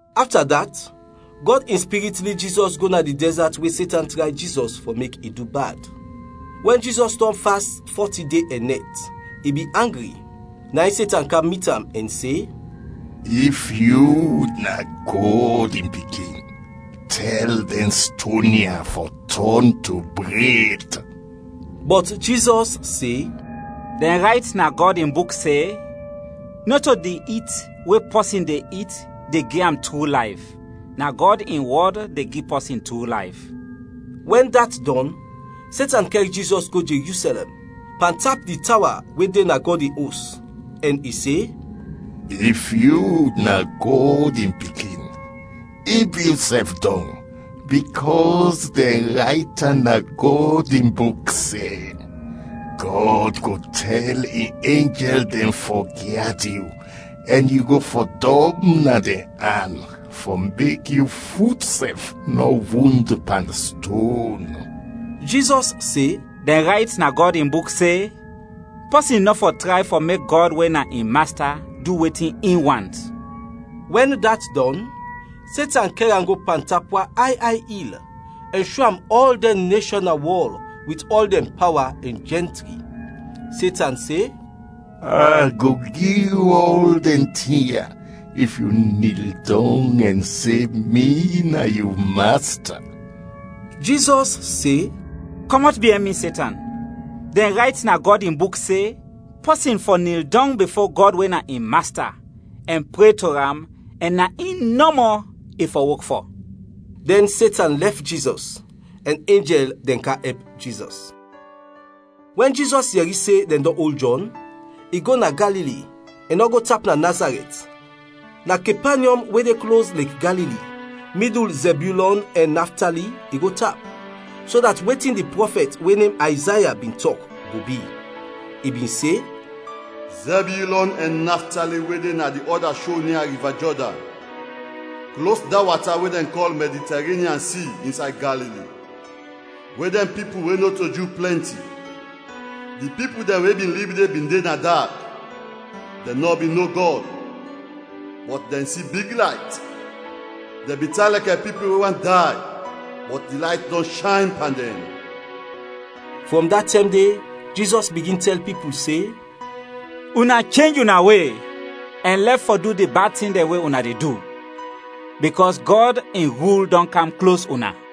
Afta dat, Gɔd in Spirit lid Jizɔs go na di dɛzat we Setan tray Jizɔs fɔ mek i du bad. Wɛn Jizɔs dɔn fast fɔti de ɛn nɛt, i bin angri. Na in Setan kam mit am ɛn se, “If yu na Gɔd in Pikin, tɛl dɛn ston ya fɔ tɔn to bred.” Bɔt Jizɔs se, “Dɛn rayt na Gɔd in Buk se, ‘Nɔto di it we pɔsin de it de gi am tru layf, na Gɔd in wɔd de gi pɔsin tru layf.’” Wɛn dat dɔn, Setan kɛr Jizɔs go Jerusɛlɛm, pantap di tawa we de na Gɔd in Os, ɛn i se, “If yu na Gɔd in Pikin, ib yusɛf dɔng, bikɔs dɛn rayt na Gɔd in Buk se, ‘Gɔd go tɛl in enjɛl dɛn fɔ gyad yu, ɛn yu go fɔdɔm na dɛn an, fɔ mek yu fut sɛf nɔ wund pan ston!’” Jizɔs se, “Dɛn rayt na Gɔd in Buk se, ‘Pɔsin nɔ fɔ tray fɔ mek Gɔd we na in Masta du wetin in want.’” Wɛn dat dɔn, Setan kɛr am go pantap wan ay ay il ɛn sho am ɔl dɛn neshɔn na wɔl wit ɔl dɛn pawa ɛn jɛntri. Setan se, “A go gi yu ɔl dɛn tin ya, if yu nil dɔng ɛn se mi na yu masta.” Jizɔs se, “Kɔmɔt biɛn mi, Setan! Dɛn rayt na Gɔd in Buk se, ‘Pɔsin fɔ nil dɔng bifo Gɔd we na in Masta ɛn pre to am ɛn na in nɔmɔ i fɔ wok fɔ.’” Dɛn Setan lɛf Jizɔs, ɛn enjɛl dɛn kam ɛp Jizɔs. Wɛn Jizɔs yɛri se dɛn dɔn ol Jɔn, i go na Galili. I nɔ go tap na Nazarɛt, na Kepanyɔm we de klos Lek Galili, midul Zebyulɔn ɛn Naftali, i go tap, so dat wetin di prɔfɛt we nem Ayzaya bin tɔk, go bi. I bin se, “Zebyulɔn ɛn Naftali we de na di ɔda sho nia Riva Jɔdan, klos da wata we dɛn kɔl Mɛditarenyan Si, insay Galili, we dɛn pipul we nɔto Ju plɛnti; di pipul dɛn we bin lib de bin de na dak, dɛn nɔ bin no Gɔd, bɔt dɛn si big layt; dɛn bin tan lɛkɛ pipul we want day, bɔt di layt dɔn shayn pan dɛn.” Frɔm da tɛm de Jizɔs bigin tɛl pipul se, “Una chenj una we ɛn lɛf fɔ du di bad tin dɛn we una de du, bikɔs Gɔd in rul dɔn kam klos una.”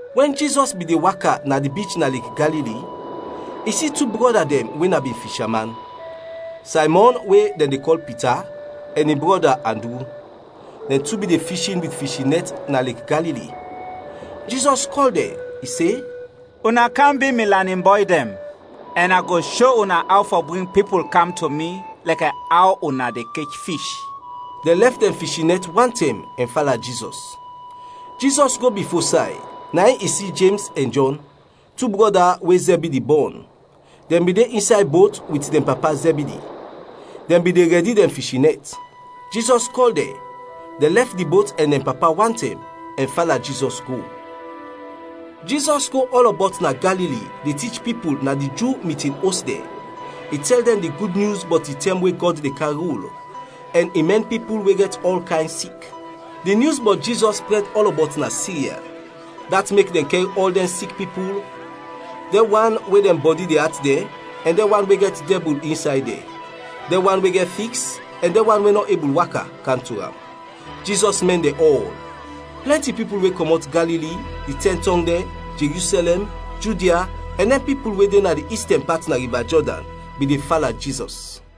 Wɛn Jizɔs bin de waka na di bich na Lek Galili, i si tu brɔda dɛn we na bin fisha man, Saymɔn we dɛn de kɔl Pita ɛn in brɔda Andru, dɛn tu bin de fishin wit fishin nɛt na Lek Galili. Jizɔs kɔl dɛn, i se, “Una kam bi mi lanin bɔy dɛn, ɛn a go sho una aw fɔ bring pipul kam to mi lɛkɛ aw una de kech fish.” Dɛn lɛf dɛn fishin nɛt wantɛm ɛn fala Jizɔs. Jizɔs go bifo say, na in i si Jems ɛn Jɔn, tu brɔda we Zɛbidi bɔn. Dɛn bin de insay bot wit dɛn papa Zɛbidi, dɛn bin de rɛdi dɛn fishin nɛt. Jizɔs kɔl dɛn, dɛn lɛf di bot ɛn dɛn papa wantɛm, ɛn fala Jizɔs go. Jizɔs go ɔlɔbɔt na Galili de tich pipul na di Ju mitin os dɛn, i tɛl dɛn di Gud Nyus bɔt di tɛm we Gɔd de kam rul, ɛn i mɛn pipul we gɛt ɔl kayn sik. Di nyus bɔt Jizɔs prɛd ɔlɔbɔt na Sirya, dat mek dɛn kɛr ɔl dɛn sik pipul, dɛn wan we dɛn bɔdi de at dɛn ɛn dɛn wan we gɛt dɛbul insay dɛn, dɛn wan we gɛt fiks, ɛn dɛn wan we nɔ ebul waka, kam to am; Jizɔs mɛn dɛn ɔl. Plɛnti pipul we kɔmɔt Galili, di Tɛn Tɔng dɛn, Jerusɛlɛm, Judia, ɛn dɛn pipul we de na di istɛn pat na Riva Jɔdan, bin de fala Jizɔs.